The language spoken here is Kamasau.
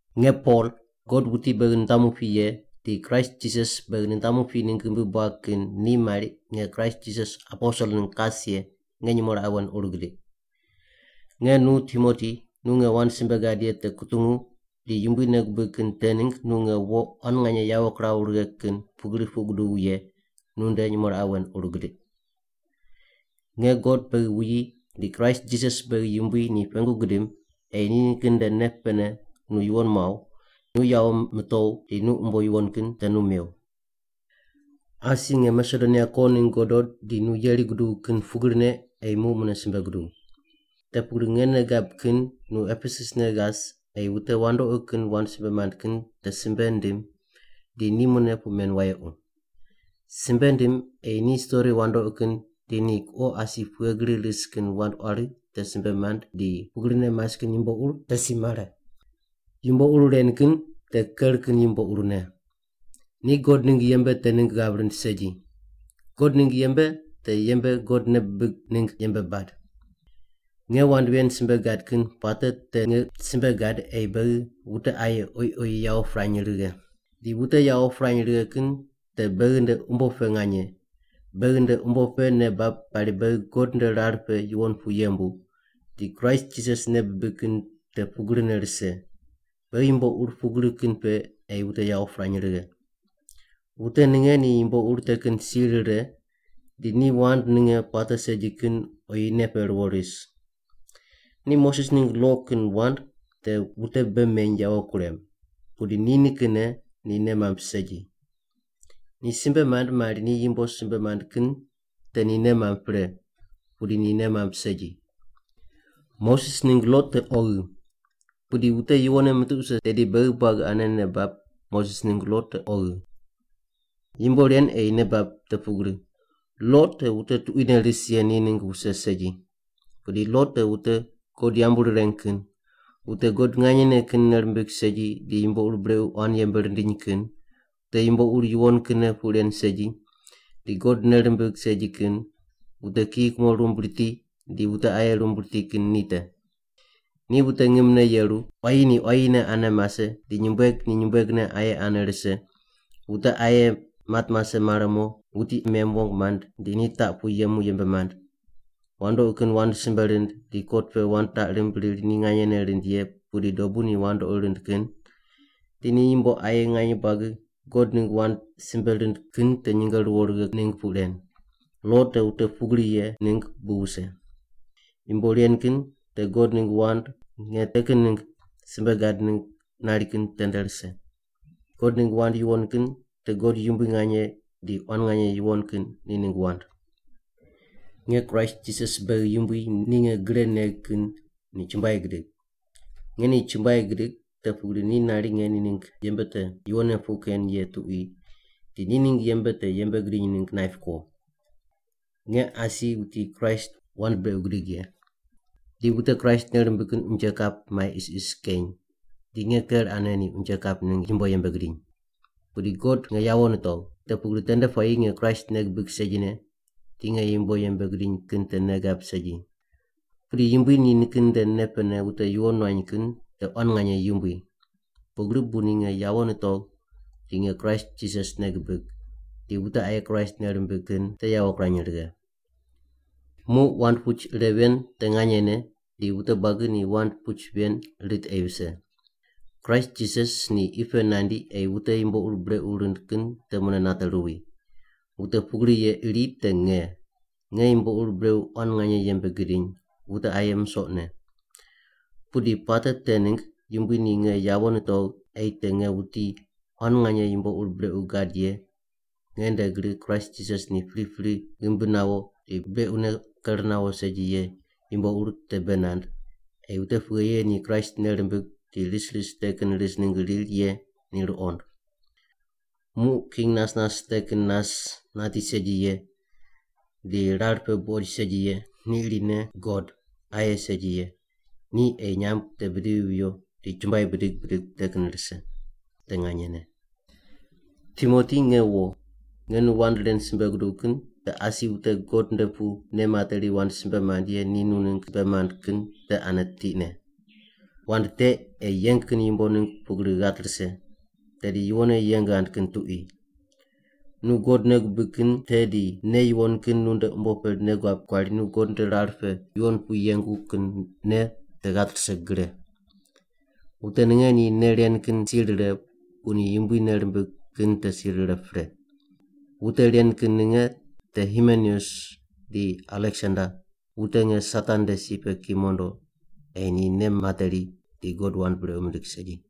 Nge Pol, God wuti beghi nitamu pi ye di Kraist Jisas beghi nitamu pi ningg ghimbi buag kin ni mari nge Kraist Jisas aposel ningg kas ye, nge nyumo raqe wen ur gidiq. Nge nu Timoti nu nge wand simbe gad ye te kutungu di Yumbui nei gubig kin te ningg nu nge wo quan nganye yawo kiraw righe kin pugri puq guduw ye, nunde nyumo raqe wen ur gidiq. Nge God beghi wuyi di Kraist Jisas beghi Yumbui ni pengu gidim ei ni nikin nde nei pene nu yuwon muaw, nu yawo mitow di ni umbo yuwon kin te nu mew. Asi nge Masedonia ko ningg godo di nu yeri guduw kin pugrine ei muq mune simbe guduw. Te pugri nge nei gab kin nu Epesus ne ghas ei wute wandoqi kin wand simbe mand kin te simbe ndim di ni mune puq men wayequ. Simbe ndim ei ni stori wandoqi kin di ni kuqo asi pughe gri ris kin wand quari te simbe mand di pugrine mas kin yumbo ur te si mare. Yumbo ur ren kin te ker kin yumbo urne. Ni God ningg yembe te ningg ghav rind segi. God ningg yembe te yembe God nei bibig ningg yembe bad. Nge wand ven simbe gad kin puate te nge simbe gad ei beghi wute aye oyi oyi yawo pirany righe. Di wute yawo pirany righe kin te beghi nde umbo pe nganye, beghi nde umbo pe nei bab pari beghi God nde rar pe yuwon pu yembu, di Kraist Jisas nei bibig kin te pugrine rise. Beghi yumbo ur pugri kin pe ei wute yawo pirany righe. Wute ninge ni yumbo ur te kin si rire di ni wand ninge puate segi kin oyi nei pe ruwo ris. Ni Moses ningg lo kin wand te wute bei meny yawo kurem, pudi ni nikinne ni nei mamb segi. Ni simbe mand mari ni yumbo simbe mand kin te ni nei mamb pre, pudi ni nei mamb segi. Moses ningg lo te oghi. Pudi wute yuwonne mitiq wuse tedi beghi buagi ane nei bab Moses ningg lo te oghi. Yumbo ren ei nei bab te pugri, lo te wute tuquine ris ye ni ningg wuse segi. Pudi lo te wute God yambu rireng kin, wute God nganyene kin nei rimbig segi di yumbo ur brequ quan yembe rindiny kin, wute yumbo ur yuwon kinne puq ren segi, di God nei rimbig segi kin, wute kiyi kumo rumb riti di wute aye rumb riti kin ni te. Di wute ngimne yeru, quayi ni quayine aye ane mase di nyumbueg ni nyumbuegne aye ane rise, wute aye mat mase mare mo wuti aye mem wong mand di ni taq pu yemu yembe mand, wandoqi kin wand simbe rind di kot pe wand taq rimb riri ni nganyene rind ye pudi dobu ni wandoqi rind kin, di ni yumbo aye nganye buagi God ningg wand simbe rind kin te nyinge ruwo righe ningg puq ren. Lo te wute pugri ye ningg bu wuse. Yumbo ren kin te God ningg wand nge te kin ningg simbe gad ningg nari kin tende rise. God ningg wand yuwon kin te God yumbui nganye di quan nganye yuwon kin ni ningg wand. Nge Kraist Jisas beghi Yumbui ni nge gre negh kin ni chumbuai gidig. Nge ni chumbuai gidig te pugri ni nari nge ni ningg yembe te yuwonne puq ken ye tuqui di ni ningg yembe te yembe gidiny ningg naip ko. Nge asi wuti Kraist wand brequ gidig ye, di wute Kraist nei rimbig kin unje kap mai isis keny di nge ker ane ni unje kap ningg yumbo yembe gidiny. Pudi God nge yawo nitogh, te pugri tende puayi nge Kraist nei gibig segine di nge yumbo yembe gidiny kin te nei gab segi. Pudi Yumbui ni nikin nde nei pene wute yuwon nuany kin te quan nganye yumbui. Pugri bu ni nge yawo nitogh di nge Kraist Jisas nei gibig, di wute aye Kraist nei rimbig kin te yawo kirany righe. Muq wand puch ire ven te nganyene di wute buagi ni wand puch ven rit ei vise: Kraist Jisas ni qi pe nandi ei wute yumbo ur brequ rind kin te mune nate ruwi. Wute pugri ye iri te nge, nge yumbo ur brequ quan nganye yembe gidiny, wute aye musoqne. Pudi puate te ningg Yumbui ni nge yawo nitogh ei te nge wuti quan nganye yumbo ur brequ gad ye nge nde gri Kraist Jisas ni pripri ghimbi nawo di brequne ker nawo segi ye yumbo ur te bei nand, ei wute pughe ye ni Kraist nei rimbig di ris ris te kin ris ningg riri ye ni ruqond. Muq King nas nas te kin nas nati segi ye, di rar pe buqoid segi ye, ni irine God, aye segi ye, ni ei ni nyamb te bidivi viyo di chumbuai bidig bidig te kin rise. Te nganyene. Timoti nge wo, nge nu wand ren simbe guduw kin te asi wute God nde pu nei materi wand simbe mand ye ni nu ningg simbe mand kin te ane tiqne. Wand te ei yeng kin yumbo ningg pugri ghat rise, tedi yuwonne yeng ghand kin tuqui. Nu God nei gubig kin te di nei yuwon kin nunde umbo pe nei guab kuari nu God nde rar pe yuwon pu yengu kin nei te ghat rise gre. Wute ninge ni nei ren kin si rire bu ni Yumbui nei rimbig kin te si rire pre. Wute ren kin ninge te Himeneus di Aleksander, wute nge Satan nde si pe ki mondo ei ni nei materi di God wand brequ mindig segi.